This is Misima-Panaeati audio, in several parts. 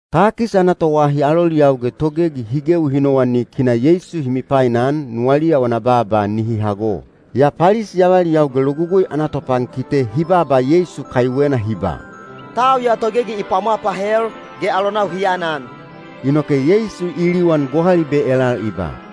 Takis ana toahi aloliyau ge togegi hi gewi hi nowanik hi na Yeisu hi mipainan nuwaliya wana baaba nihi hago. Yaa Palisi avaliyau ge Logugui ana topankite hi baaba Yeisu kaiwena hi ba, “Tau ya togegi i pwamwa pahel, ge alonau hi anan.” Inoke Yeisu i liwan gohalibe elal i ba,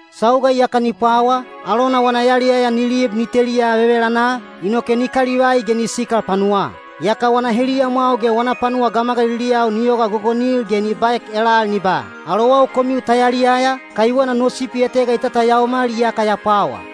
Sauga iyaka ni pwawa, alona wana yaliyaya ni lib ni teliya vevelanaa, inoke ni kalivai ge ni sikal panuwaa. Yaka wana heliyamwau ge wana panuwa gamagaliliyau ni yoga gogonil ge ni baek elal ni ba, ‘Alowau komiu ta yaliyaya, kaiwena no sipi etega i tatayaomal iyaka ya pwawa.’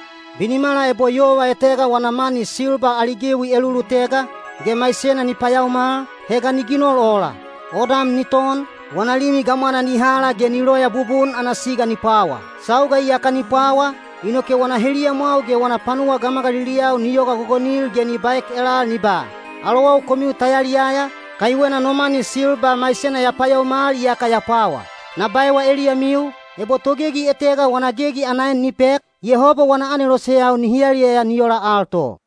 “Binimala ebo yova etega wana mani silba ali gewi elulutega, ge maisena ni payaomal, he ga ni ginol ola? Odam ni ton, wana limi gamwana ni hala ge ni loya bubun ana siga ni pwawa. Sauga iyaka ni pwawa, inoke wana heliyamwau ge wana panuwa gamagaliliyau ni yoga gogonil ge ni baek elal ni ba, ‘Alowau komiu ta yaliyaya, kaiwena no mani silba maisena ya payaomal iyaka ya pwawa.’ Na baewa eliyamiu, ebo togegi etega wana gegi ana en ni pek, Yehoba wana aneloseyau nihi yaliyaya ni ola al to.”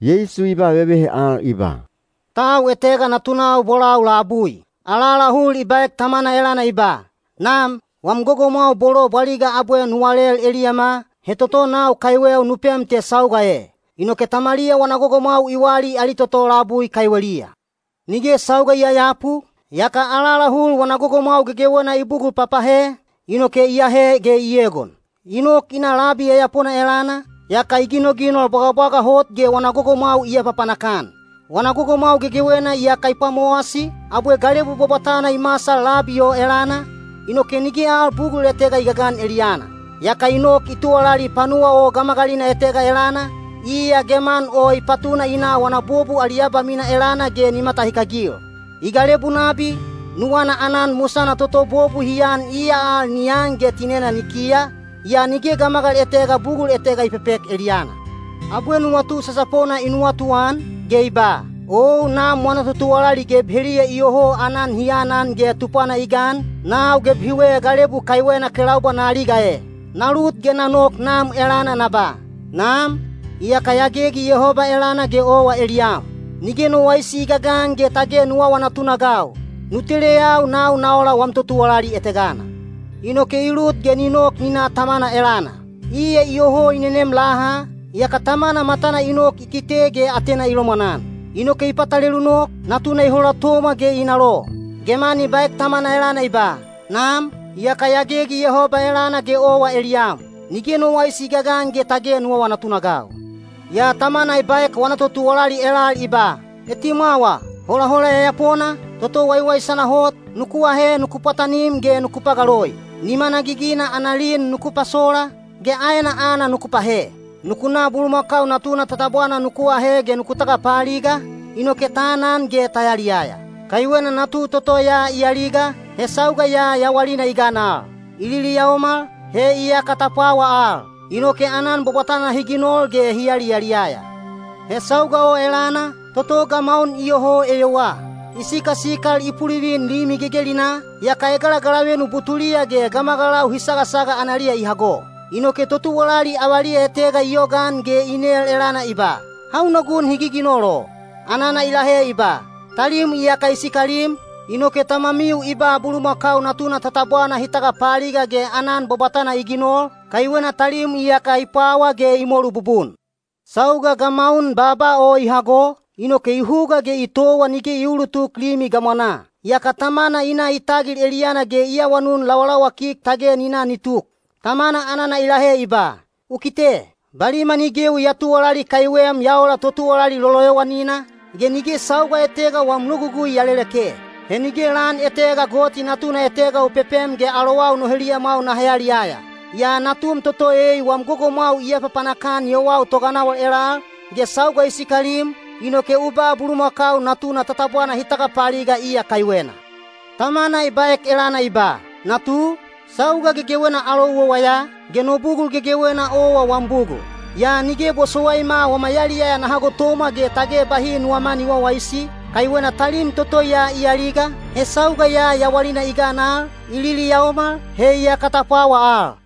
Yeisu i ba vevehe al i ba, “Tau etega natunau bolau labui. Alaalahul i baek tamana elana i ba, ‘Nam, wam gogomwau bolo bwaliga abwe nu walel eliyama, he toto nau kaiweu nu pem te sauga e.’ Inoke tamaliya wana gogomwau i wali ali toto labui kaiweliya. Nige sauga i yayapu, yaka alaalahul wana gogomwau gegewena i bugul papahe, inoke i ahe ge i egon. I nok i na labi yayapona elana, yaka i ginoginol bwagabwaga hot ge wana gogomwau i apapanak-an. Wana gogomwau gegewena iyaka i pwamowasi, abwe galebu bwabwatana i masal labi o elana, inoke nige al bugul etega i gagan eliyana. Yaka i nok i tuwalali panuwa o gamagalina etega elana, iya geman o i patuna i na wana bobu wali abamina elana ge ni matahikagil. I galebu nabi, nuwana aanan musana toto bobu hi an iya al ni an ge tinena ni kiya, yaa nige gamagal etega bugul etega i pepek eliyana. Abwe nuwatu sasapona i nuwatuan, ge i ba, ‘Ou nam wana totuwalali geb heliya iyoho aanan hi anan ge tupwana i gan, nau geb hiwe galebu kaiwena kelaubwa na aliga e! Na lut ge na nok nam elana na ba: Nam, iyaka ya gegi Yehoba elana ge owa eliyam. Nige no waisi i gagan ge tage nu awa natunagau; nu teleyau nau na ola wam totuwalali etegana.’ Inoke i lut ge ni nok ni na tamana elana. Iya iyoho i nenem laha, yaka tamana matana i nok i kite ge atena i lomwanan. Inoke i patalelu nok, natuna i holatomwa ge i nalo. Geman i baek tamana elana i ba, ‘Nam, iyaka ya gegi Yehoba elana ge owa eliyam. Nige no waisi i gagan ge tage nu awa natunagau.’ Yaa tamana i baek wana totuwalali elal i ba, ‘Etimwawa! Holahola yayapona, toto waiwaisana hot, nuku ahe nuku pwatanim ge nuku pagaloi. Nimana gigina ana lin nuku pasola, ge aena aana nuku pahe. Nuku na bulumakau natuna tatabwana nuku ahe ge nuku tagapaaliga, inoke ta anan ge ta yaliyaya. Kaiwena natu toto ya i aliga, he sauga ya yawalina i gan al; i liliyaomal, he iyaka ta pwawa al.’ Inoke aanan bwabwatana hi ginol ge hi yaliyaliyaya. He sauga o elana, toto gamaun iyoho eyowaa. I sikasikal i pulivin limi gegelinaa, yaka egalagalavenu butuliya ge gamagalau hi sagasaga analiya i hago. Inoke totuwalali avaliya etega i yogaan ge i nel elana i ba, ‘Hauna gun hi giginol o?’ Anana i lahe i ba, ‘Talim iyaka i sikalim, inoke tamamiu i ba bulumakau natuna tatabwana hi tagapaaliga ge aanan bwabwatana i ginol, kaiwena talim iyaka i pwawa ge i molu bubun.’ Sauga gamaun baaba o i hago, inoke i huga ge i towa nige i uulutuk limi gamwanaa. Yaka tamana i na i tagil eliyana ge i awanun lawalawakik tage ni na ni tuk. Tamana anana i lahe i ba, ‘U kite! Baliman i gewi ya tuwalali kaiwem ya ola totuwalali loloyowanina, ge nige sauga etega wam logugui ya leleke. He nige lan etega goti natuna etega u pepem ge alowau no heliyamwau naha yaliyaya. Yaa natum toto ei wam gogomwau i apapanak-an yowau toganawal elal, ge sauga i sikalim, inoke u ba bulumakau natuna tatabwana hi tagapaaliga iya kaiwena.’ Tamana i baek elana i ba, ‘Natu, sauga gegewena alou owa ya, ge no bugul gegewena owa wam bugul. Yaa nige bosowaima wama yaliyaya naha gotomwa ge tage bahi nuwama ni wawaisi, kaiwena talim toto ya i aliga, he sauga ya yawalina i gan al, i liliyaomal, he iyaka ta pwawa al.’”